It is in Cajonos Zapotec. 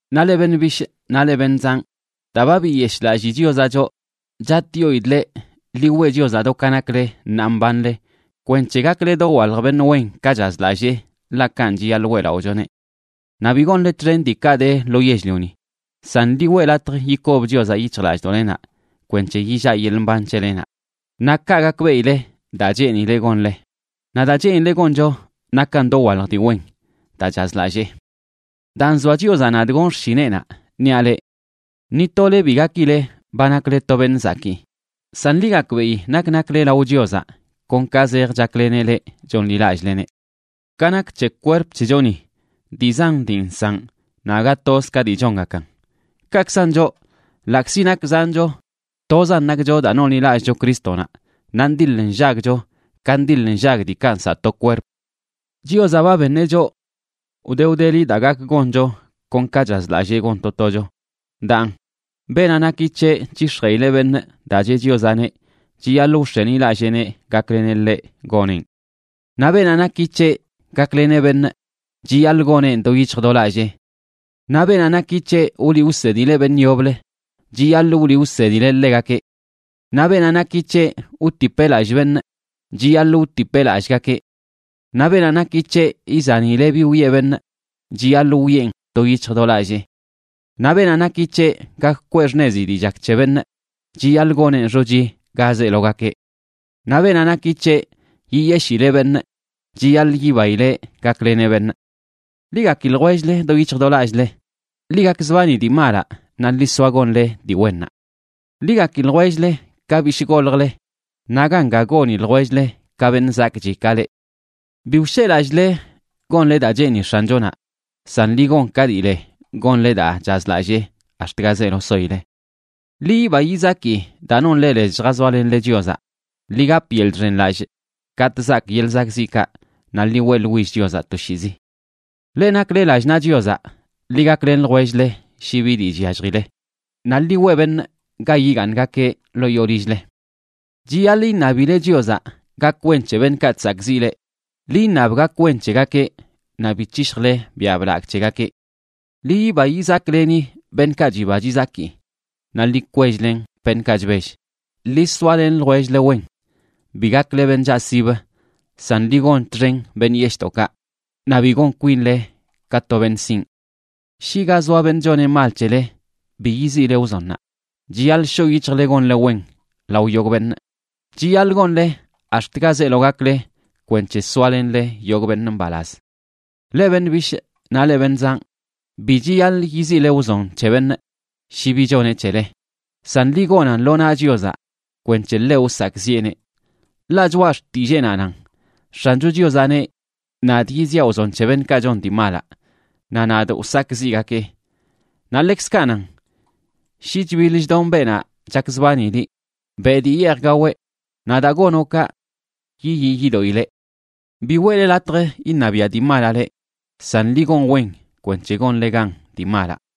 Naꞌ leꞌ beṉꞌ bishꞌ naꞌ leꞌ beṉꞌ zanꞌ, daa ba biyeshꞌlallii Chiozaꞌ choꞌ, chatꞌyoidꞌ leꞌ, ḻi weꞌ Chiozaꞌ do ka nakle ṉaa mbanle kwenc̱he gakle dowalj beṉꞌ wen ka chazlallee, ḻaꞌ kanꞌ chiyaḻꞌ weꞌlaꞌochoneꞌ. Naꞌ bi gonle txen diikaꞌ de lo yell-lioni, san ḻi weꞌ latj yikob Chiozaꞌ yic̱hjlallꞌdoꞌlenaꞌ kwenc̱he yillaꞌ yeḻꞌ mban c̱helenaꞌ. Naꞌ kaꞌ gakbeꞌile daa cheenileꞌ gonle. Naꞌ daa cheenileꞌ goncho nakan dowalj dii wen, daa chazlallee. Daa nzoa Chiozaꞌ nadꞌ gonꞌ xshineꞌnaꞌ, niaꞌ leꞌ: Ni tole bi gakile ba nakle to beṉꞌ zakii. San ḻi gakbeꞌi nak nakle lao Chiozaꞌ kon ka zej chakleneꞌ leꞌ chonḻilallꞌleneꞌ. Ka nak c̱he kwerp c̱hechoni, dii zan dii nsaꞌn naꞌ aga toz ka dii chongakan. Kaꞌkzan choꞌ, ḻaꞌkzi nak zancho, tozan nakcho daa nonḻilallꞌcho Crístonaꞌ, naꞌ ndiḻ nllagcho ka ndiḻ nllag diikaꞌ nsaꞌ to kwerp. Chiozaꞌ ba beṉeꞌ choꞌ wde wdeli daa gak goncho kon ka chazlallee gon to tocho. Daan, beenaꞌ naki c̱heꞌ c̱hix̱jeꞌileꞌ beṉꞌ daa cheꞌ Chiozaꞌneꞌ, chiyaḻꞌ wx̱enilalleeneꞌ gakleneꞌ ḻeꞌ goneꞌn. Naꞌ beenaꞌ naki c̱heꞌ gakleneꞌ beṉꞌ, chiyaḻꞌ goneꞌn do yic̱hj do lallee. Naꞌ beenaꞌ naki c̱heꞌ wliꞌ wsedileꞌ beṉꞌ yoblə, chiyaḻꞌ wliꞌ wsedileꞌ ḻegakeꞌ. Naꞌ beenaꞌ naki c̱heꞌ wtipeꞌ lallꞌ beṉꞌ, chiyaḻꞌ wtipeꞌ lallꞌgakeꞌ. Naꞌ beenaꞌ naki c̱heꞌ izanileꞌ bi wiꞌe beṉꞌ, chiyaḻꞌ wiꞌen do yic̱hj do lallee. Naꞌ beenaꞌ naki c̱heꞌ gak kwee xṉezi dii chak c̱he beṉꞌ, chiyaḻꞌ goneꞌn xochi ga zeelo gakeꞌ. Naꞌ beenaꞌ naki c̱heꞌ yiyeshileꞌ beṉꞌ, chiyaḻꞌ yibaileꞌ gakleneꞌ beṉꞌ. Ḻi gaki ljwell-le do yic̱hj do lallꞌle. Ḻi gakzbani dii malaꞌ naꞌ ḻi soa gonle dii wennaꞌ. Ḻi gaki ljwell-le ka bishꞌ goljle, naꞌ ganga goni ljwell-le ka beṉꞌ zakꞌchi ka leꞌ. Bi wsheꞌlallꞌle gonle daa cheeni X̱anchonaꞌ, san ḻi gon ka dii le gonle daa chazlallee ax̱t ga zeelo soile. Ḻi yiba yizaki daa nonle lez lljazoalenle Chiozaꞌ, ḻi gap yeḻꞌ chxenlallꞌ katꞌ zaak yeḻꞌ zakꞌziꞌkaꞌ, naꞌ ḻi weꞌḻwill Chiozaꞌ toshiizi. Leꞌ nakle lallꞌ naꞌ Chiozaꞌ, ḻi gaklen ljwell-le shi bi dii chyalljile. Naꞌ ḻi weꞌ beṉꞌ ga yigaaṉgakeꞌ ḻoo yoo lill-le. Chiyaḻꞌ iṉabile Chiozaꞌ gak wen c̱he beṉꞌkaꞌ chsakꞌziꞌ leꞌ. Ḻi iṉab gak wen c̱hegakeꞌ naꞌ bi c̱hishjle biaꞌ blagꞌ c̱hegakeꞌ. Ḻi yiba yizakleni beṉꞌkaꞌ chiba chizaki naꞌ ḻi kwell-len beṉꞌkaꞌ chbell. Ḻi soalen ljwell-le wen. Bi gakle beṉꞌ chaꞌsib, san ḻi gon txen beṉꞌ yeshꞌdoꞌkaꞌ. Naꞌ bi gon kwinle ka to beṉꞌ sinꞌ. Shi ga zoa beṉꞌ choneꞌ mal c̱hele, bi yiziꞌle wzonnaꞌ. Chiyaḻꞌ shoꞌ yic̱hjle gonle wen lao yogꞌ beṉꞌ. Chiyaḻꞌ gonle ax̱t ga zeelo gakle kwenc̱he soalenle yogꞌ beṉꞌ mbalaz. Leꞌ beṉꞌ bishꞌ naꞌ leꞌ beṉꞌ zanꞌ, bi chiyaḻꞌ yiziꞌle wzon c̱he beṉꞌ shi bi choneꞌ c̱hele, san ḻi gonan lo naꞌ Chiozaꞌ kwenc̱he ḻeꞌ wsakꞌziꞌeneꞌ. Ḻaꞌ Choꞌa Xtilleenaꞌ nan: “X̱ancho Chiozaꞌ neꞌ: Nadꞌ yiziaꞌ wzon c̱he beṉꞌkaꞌ chon dii malaꞌ. Naꞌ nadꞌ wsakꞌziꞌgakee.” Naꞌ ḻekzkaꞌ nan: “Shi chbiḻ chdon beenaꞌ chakzbani liꞌ, beꞌ dii yeej gaweꞌ. Naꞌ daa gonoꞌ kaꞌ, yiyii yidoꞌileꞌ.” Bi weꞌle latj iṉabiaꞌ dii malaꞌ leꞌ, san ḻi gon wen kwenc̱he gonle gan dii malaꞌ.